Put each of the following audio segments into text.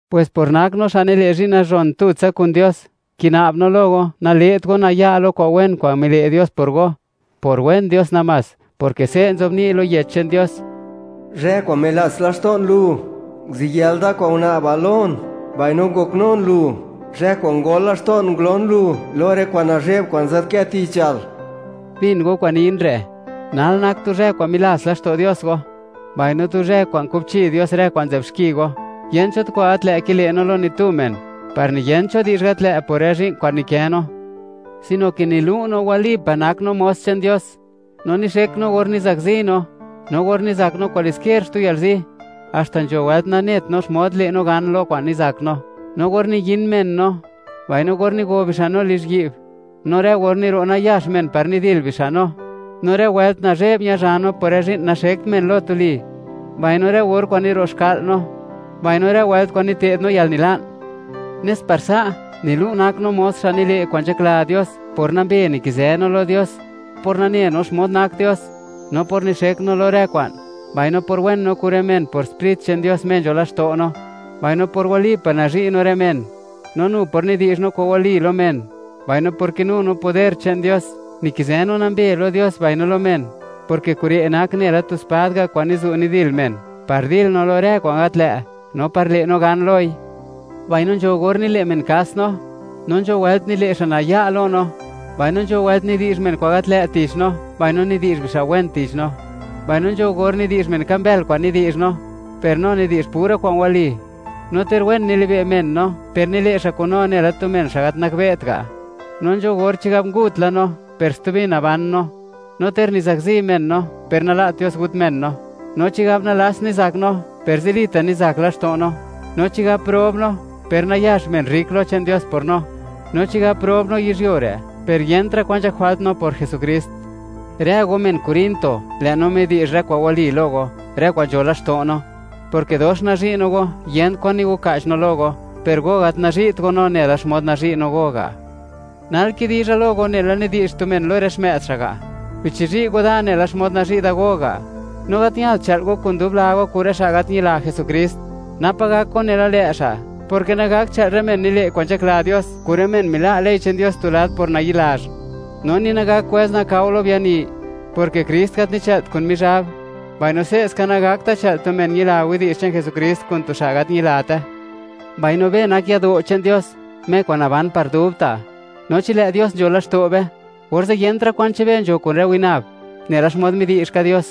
Pwes por nak no xa' nile' zhi'n nazhon tutsa kun Dios, kina'b no lo go, nale't go naya' lo kwa'n wen kwa'n mile' Dios por go, por wen Dios namás, porke se' nzobni' lo Yech che'n Dios: Zhë kwa'n milats laxto'n lu, nguziyël da kwa'n una'bal lon; mbaino ngoknun lu, zhë kwa'n ngol laxto'n ngulon lu lo rë kwa'n nazhe'b kwa'n nzadkë tichal. ¡Bin go kwa'n nin re'! Nal nak tu zhë kwa'n milats laxto' Dios go; mbaino tu zhë kwa'n kubchi Dios rë kwa'n nzë'b xki go. Yent cho tu kwa'n gat lë' kile' no lo ni tu men, par niyent cho di'zh gat lë' por rë zhi'n kwa'n nikë no, sino ke nilu' no, walipa' nak no mos che'n Dios, no nixek no or nizakzi no, no or nizak no kwaliskier xtu yalzi, haxta nzho wëlt nanet no xmod le' no gan lo kwa'n nizak no; no or niyin men no, mbaino or nigo bixa' no lizhyi'b, no rë or niro' nayax men par nidil bixa' no, no rë wëlt nazhe'b ñazha no por rë zhi'n naxekt men lo tuli, mbaino rë or kwa'n niro' xka'l no, mbaino rë wëlt kwa'n nite'd no yalnila'n, nes par sa', nilu' nak no, mos xa' nile' kwa'n nzhakla Dios, por nambe nikizë no lo Dios; por nane no xmod nak Dios; no por nixek no lo rë kwa'n; mbaino por wen no kun rë men por Sprit che'n Dios Me nzho laxto' no; mbaino por walipa' nazhi' no rë men; no nu por nidi'zh no kwa'n wali lo men, mbaino por kinu no poder che'n Dios. Nikizë no nambe lo Dios mbaino lo men, porke kure' nak nela tu spad ga' kwa'n nizu' nidil men, par dil no lo rë kwa'n gat lë', no par le' no gan loi. Mbaino nzho gor nile' men kas no, no nzho wëlt nile' xa' naya' lo no; mbaino nzho wëlt nidi'zh men kwa'n gat lë' tich no, mbaino nidi'zh bixa' wen tich no; mbaino nzho gor nidi'zh men, ka mbël kwa'n nidi'zh no, per no nidi'zh pura kwa'n wali. No ter wen nilibe' men no, per nile' xa' kun no nela tu men, xa' gat nakbe't ga'. No nzho gor, chigab, ngut la no, per stubi naban no; no ter nizakzi men no, per nala't Dios, gut men no. No chigab nalats nizak no, per zilita' nizak laxto' no; no chigab prob no, per nayax men rrik lo che'n Dios por no; no chigab prob no yizhyuo re', per yentra' kwan nzhak jwalt no por Jesukrist. Rë go, men Corinto, lë' no midi'zh rë kwa'n wali lo go, rë kwa'n nzho laxto' no. Porke dox nazhi' no go, yent kwan nigoka'ch no lo go, per go gat nazhi't go no nela xmod nazhi' no go ga'. Nal kidizha lo go, nela nidi'zh tu men lo rë xmë'd xa' ga': “¡Bichizhi' go da nela xmod nazhi' da go ga'!” No gat ñalt chë'l go kun dub la go kun rë xa' gat ñila Jesukrist, napa gak go nela lë' xa'; porke nagakt chë'l rë men nile' kwa'n nzhakla Dios kun rë men mila' ley che'n Dios tu lad por nayi'lazh, no ni nagak kwëz nakao lo biani; porke Krist gat nichë'lt kun Mizhab, mbaino se'ska nagakta' chë'l tu men ñila widi'zh che'n Jesukrist kun tu xa' gat ñilate. Mbaino be nak yado' che'n Dios, Me kwa'n naban par dubta', no chi lë' Dios nzho laxto' be, orze' yentra' kwan che'n be nzho kun rë winab, nela xmod midi'zh ka Dios: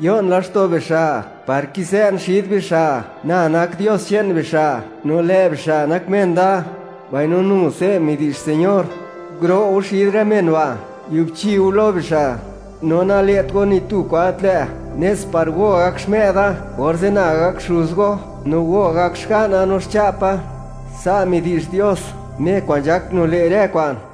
Yo'n laxto' bixa', par kizë'n xid bixa'; Na nak Dios che'n bixa', no lë' bixa' nak men da. Mbaino nu se' midi'zh Señor: Guro' go xid rë men ba', giubchi go lo bixa', no nale't go ni tu kwa'n gat lë', nes par go, gak xmë'da. Orze' Na gak Xuz go, no go gak xga'na no xcha'pa. Sa' midi'zh Dios, Me kwa'n nzhak nile' rë kwa'n.